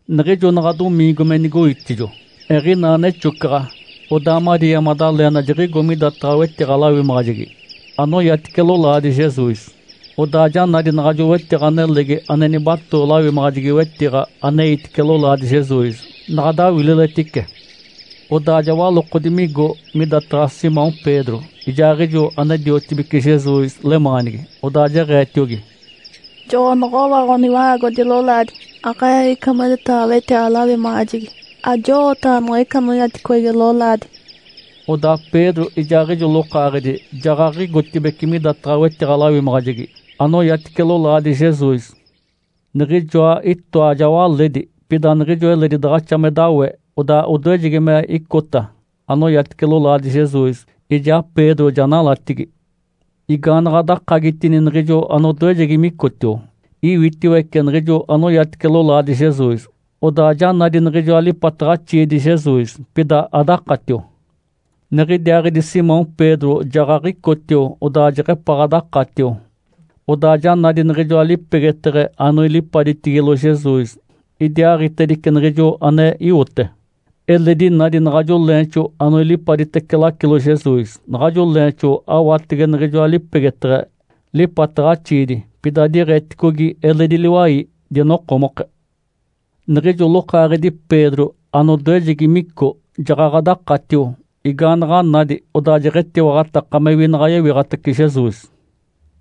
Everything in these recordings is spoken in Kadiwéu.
Niɡ̶ijo naɡ̶a domiingo me nigoitijo, eɡ̶inaa nexocaɡ̶a, odaa Maria Madalena jiɡ̶igo midataɡ̶a wetiɡ̶a-lawimaɡ̶ajegi anoyatice lolaadi Jesus. Odaa ja nadi naɡ̶ajo wetiɡ̶a nelegi ane nibatoo lawimaɡ̶ajegi-wetiɡ̶a aneitice lolaadi Jesus naɡ̶a dawililetice. Odaa ja walokodi migo midataɡ̶a Simão Pedro, ijaaɡ̶ijo ane-diotibece Jesus lemaanigi. Odaa jeɡ̶eetiogi, “Joɡ̶onoɡ̶owa Ǥoniwa-aagodi lolaadi, aɡ̶e-eeɡ̶ica midataɡ̶a wetiɡ̶a-lawimaɡ̶ajegi, ajowooɡ̶otaɡ̶a niɡ̶ica anoyaticogi lolaadi.” Odaa Pedro ijaaɡ̶ijo lokaaɡ̶edi jaɡ̶aɡ̶igotibeci midataɡ̶a wetiɡ̶a-lawimaɡ̶ajegi anoyatice lolaadi Jesus. Niɡ̶ijoa itoa ja waledi, pida niɡ̶ijo eledi daɡ̶axa me dawé, odaa odoejegi me icota anoyatice lolaadi Jesus, ijaa Pedro ja nalatigi. Igaanaɡ̶a dakagitini niɡ̶ijo anodoejegi micotio, iwitiwece niɡ̶ijo anoyatice lolaadi Jesus, odaa ja nadi niɡ̶ijoa lipataɡ̶axiidi Jesus, pida adakatio. Niɡ̶idiaaɡ̶idi Simão Pedro jaɡ̶aɡ̶icotio, odaa jeɡ̶epaɡ̶a dakatio. Odaa ja nadi niɡ̶ijoa lipegeteɡ̶e anoilipaditigilo Jesus, idiaaɡ̶itedice niɡ̶ijo ane iwote. Eledi nadi naɡ̶ajo leenxo anoilipaditece lacilo Jesus. Naɡ̶ajo leenxo aɡ̶awatege niɡ̶ijoa lipegeteɡ̶e lipataɡ̶axiidi, pida diɡ̶eticogi eledi liwai, dinokomoke. Niɡ̶ijo lokaaɡ̶edi Pedro anodoejegi mico, jaɡ̶aɡ̶a dakatio. Igaanaɡ̶a nadi, odaa jeɡ̶etiwaɡ̶ataka mewi naɡ̶a yewiɡ̶atace Jesus.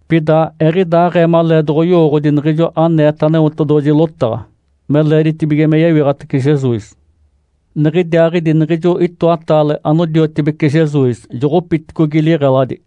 Pida eɡ̶idaaɡ̶ee maleedoɡ̶oyowooɡ̶odi niɡ̶ijo aneeta Aneotedoɡ̶oji lotaɡ̶a, me leeditibige me yewiɡ̶atace Jesus. Niɡ̶idiaaɡ̶idi niɡ̶ijo itoataale anodiotibece Jesus joɡ̶opiticogi liɡ̶eladi.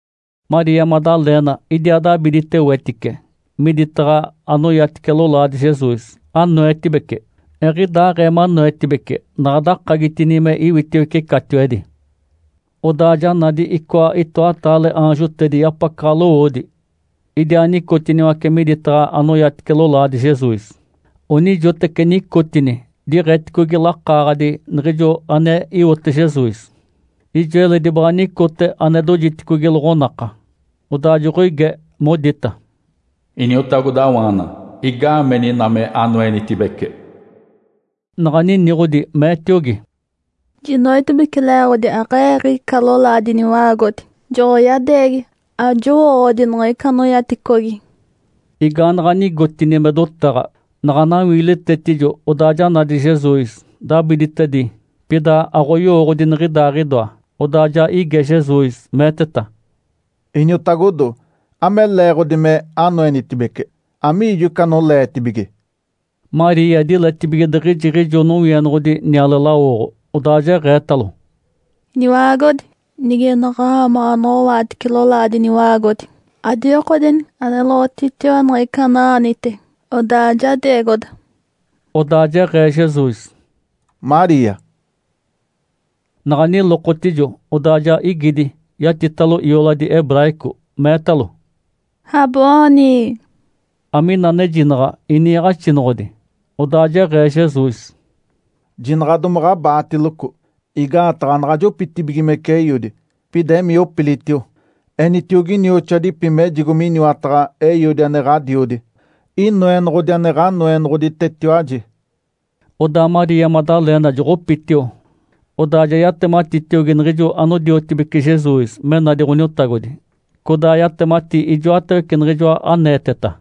Maria Madalena idiaa dabidite wetice miditaɡ̶a anoyatice lolaadi Jesus, anoetibece. Eɡ̶idaaɡ̶ee manoetibece, naɡ̶a dakagitini me iwitiwece catiwedi. Odaa ja nadi icoa itoataale aanjotedi yapacaɡ̶a lowoodi. Idiaa nicotiniwace miditaɡ̶a anoyatice lolaadi Jesus. Onijoteci nicotini diɡ̶eticogi lakaaɡ̶adi niɡ̶ijo ane iwote Jesus, ijo eledi baɡ̶a nicote ane dojitedicogi loɡ̶onaka. Odaa joɡ̶oige, modita, “Iniotagodawaana. Igaameni ina me anoenitibece?” Naɡ̶a niniɡ̶odi, meetiogi, “Jinoetibece le-eeɡ̶odi aɡ̶e-eeɡ̶ica lolaadi Iniwa-aagodi, joɡ̶oyadeegi, ajowooɡ̶odi niɡ̶ica anoyaticogi”. Igaanaɡ̶a nigotini me dotaɡ̶a, naɡ̶a nawiilitetijo, odaa ja nadi Jesus, dabiditedi, pida ayowooɡ̶odi niɡ̶idaaɡ̶idoa. Odaa ja ige Jesus, meeteta, “Iniotagodo. Ame leeɡ̶odi me anoenitibece? Amiijo ica anoleetibige?” Maria diletibige diɡ̶ijiɡ̶ijo nowienoɡ̶odi niale lawoɡ̶o. Odaa jeɡ̶eetalo, “Iniwa-aagodi. Nige naɡ̶a-aamaɡ̶a anoɡ̶owaatice lolaadi Iniwa-aagodi, adiwikodeni aneloɡ̶otitiwa niɡ̶ica ana-aanite, odaa jadeegoda.” Odaa jeɡ̶ee Jesus, “Maria!” Naɡ̶a nilokotijo, odaa ja igidi, yatitalo ioladi hebraico, meetalo, “Raboni!” (Amina anejinaɡ̶a “Iniiɡ̶axinoɡ̶odi”). Odaa jeɡ̶ee Jesus, “Jinaɡ̶a domaɡ̶a abaatiloco, igaataɡ̶a anaɡ̶a jopitibigimece Eiodi. Pida emii opilitio, enitiogi inioxoadipi mejigo miniwataɡ̶a Eiodi ane Ǥadiodi, Inoenoɡ̶odi ane Ǥanoenoɡ̶oditetiwaji”. Odaa Maria Madalena joɡ̶opitio, odaa ja yatematitiogi niɡ̶ijo anodiotibece Jesus me nadi Ǥoniotagodi, codaa yatemati ijoatawece niɡ̶ijoa aneeteta.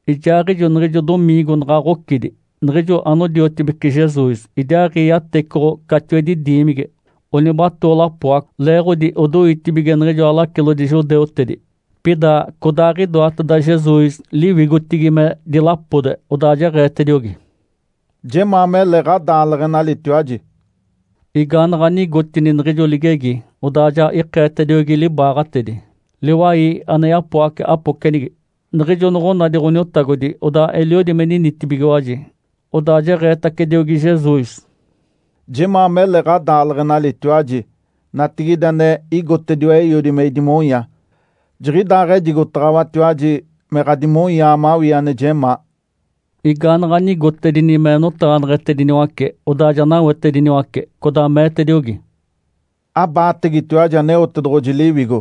Ijaaɡ̶ijo niɡ̶ijo domiingo, naɡ̶a ɡ̶ocidi, niɡ̶ijo anodiotibece Jesus idiaaɡ̶i yatecoɡ̶o catiwedi diimigi, onibatoo lapoaco, leeɡ̶odi odoitibige niɡ̶ijoa lacilodi judeutedi. Pida codaaɡ̶idoateda Jesus liwigotigi me dilapode, odaa jeɡ̶eetediogi, “Jemaa mele ɡ̶adaaleɡ̶enalitiwaji!” Igaanaɡ̶a nigotini niɡ̶ijo ligegi, odaa ja ikeetediogi libaaɡ̶atedi, liwai ane yapoace apocenigi. Niɡ̶ijo noɡ̶onadi Ǥoniotagodi, odaa eliodi me ninitibigiwaji. Odaa jeɡ̶eetacediogi Jesus, “Jemaa mele ɡ̶adaaleɡ̶enalitiwaji! Natigide ane igotediwa Eiodi me idimonya, jiɡ̶idaaɡ̶ejigotaɡ̶awatiwaji me ɡ̶adimonyaa mawii ane jemaa.” Igaanaɡ̶a nigotedini me notaɡ̶aneɡ̶etediniwace, odaa ja nawetediniwace, codaa meetediogi, “Abaategetiwaji Aneotedoɡ̶oji Liwigo.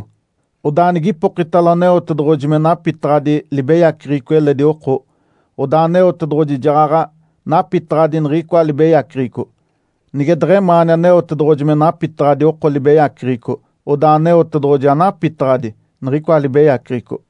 Odaa nigipokitalo Aneotedoɡ̶oji me napitaɡ̶adi libeyaceɡ̶eco eledi oko, odaa Aneotedoɡ̶oji jaɡ̶aɡ̶a napitaɡ̶adi niɡ̶icoa libeyaceɡ̶eco. Nige deɡ̶emaani Aneotedoɡ̶oji me napitaɡ̶adi oko libeyaceɡ̶eco, odaa Aneotedoɡ̶oji anapitaɡ̶adi niɡ̶icoa libeyaceɡ̶eco.”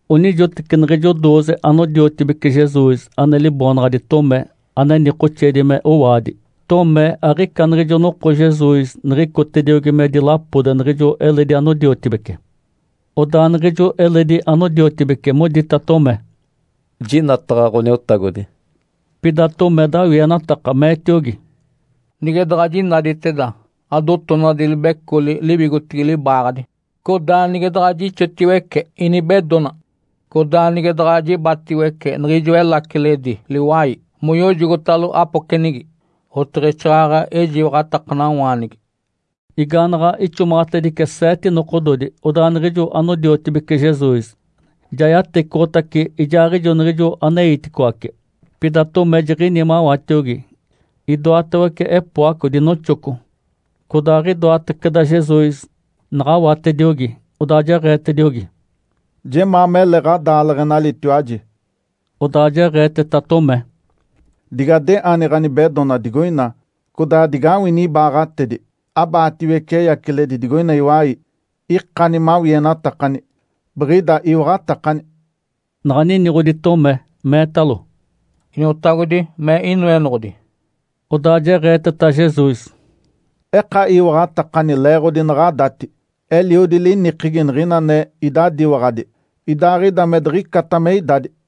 Onijoteci niɡ̶ijo dooze anodiotibece Jesus ane liboonaɡ̶adi Tomé ane nikoxeedi me “Owaadi”. Tomé aɡ̶ica niɡ̶ijo noko Jesus niɡ̶icotediogi me dilapode niɡ̶ijo eledi anodiotibece. Odaa niɡ̶ijo eledi anodiotibece modita Tomé, “Jinataɡ̶a Ǥoniotagodi”. Pida Tomé dawienataka, meetiogi, “Nige daɡ̶a jinaditeda adotonadi libecoli liwigotigi libaaɡ̶adi, codaa nige daɡ̶a jixotiwece inibedona, codaa nige daɡ̶a jibatiwece niɡ̶ijo elaciledi liwai moyojogotalo apocenigi, oteɡ̶exaaɡ̶aɡ̶a ejiwaɡ̶atakanawaanigi.” Igaanaɡ̶a ixomaɡ̶atedice seete nokododi, odaa niɡ̶ijo anodiotibece Jesus ja yatecoɡ̶otace ijaaɡ̶ijo niɡ̶ijo aneiticoace, pida Tomé jiɡ̶ini mawatiogi. Idoatawece epoaco dinoxoco. Codaaɡ̶idoataceda Jesus, naɡ̶awatediogi, odaa jeɡ̶eetediogi, “Jemaa mele ɡ̶adaaleɡ̶enalitiwaji!” Odaa jeɡ̶eeteta Tomé, “Dige adeoni ɡ̶anibedona digoina, codaa digawini ibaaɡ̶atedi. Abaatiwece eyaciledi digoina iwai. Ikani mawienatakani, biɡ̶ida iwaɡ̶atakani”. Naɡ̶a niniɡ̶odi Tomé, meetalo, “Iniotagodi, me Inoenoɡ̶odi”. Odaa jeɡ̶eeteta Jesus, “Eka iwaɡ̶atakani leeɡ̶odi naɡ̶adati. Eliodi linikegi niɡ̶ina ane idadiwaɡ̶adi, idaaɡ̶ida me diɡ̶icata me idadi”.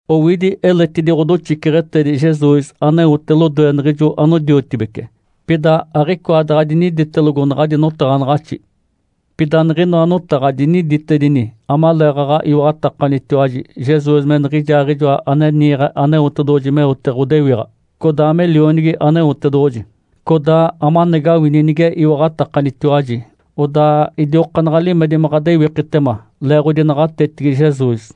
Owidi eletidi ɡ̶odoxiceɡ̶etedi Jesus aneote lodoe niɡ̶ijo anodiotibece. Pida aɡ̶icoa daɡ̶a diniditelogo naɡ̶adi notaɡ̶anaɡ̶axi. Pida niɡ̶inoa notaɡ̶a diniditedini amaleeɡ̶aɡ̶a iwaɡ̶atakanitiwaji Jesus me niɡ̶ijaaɡ̶ijoa ane niiɡ̶e Aneotedoɡ̶oji meote ɡ̶odewiɡ̶a, codaa me Lionigi Aneotedoɡ̶oji, codaa amanagawini nige iwaɡ̶atakanitiwaji, odaa idiokaanaɡ̶a limedi me ɡ̶adewikitema leeɡ̶odi naɡ̶atetigi Jesus.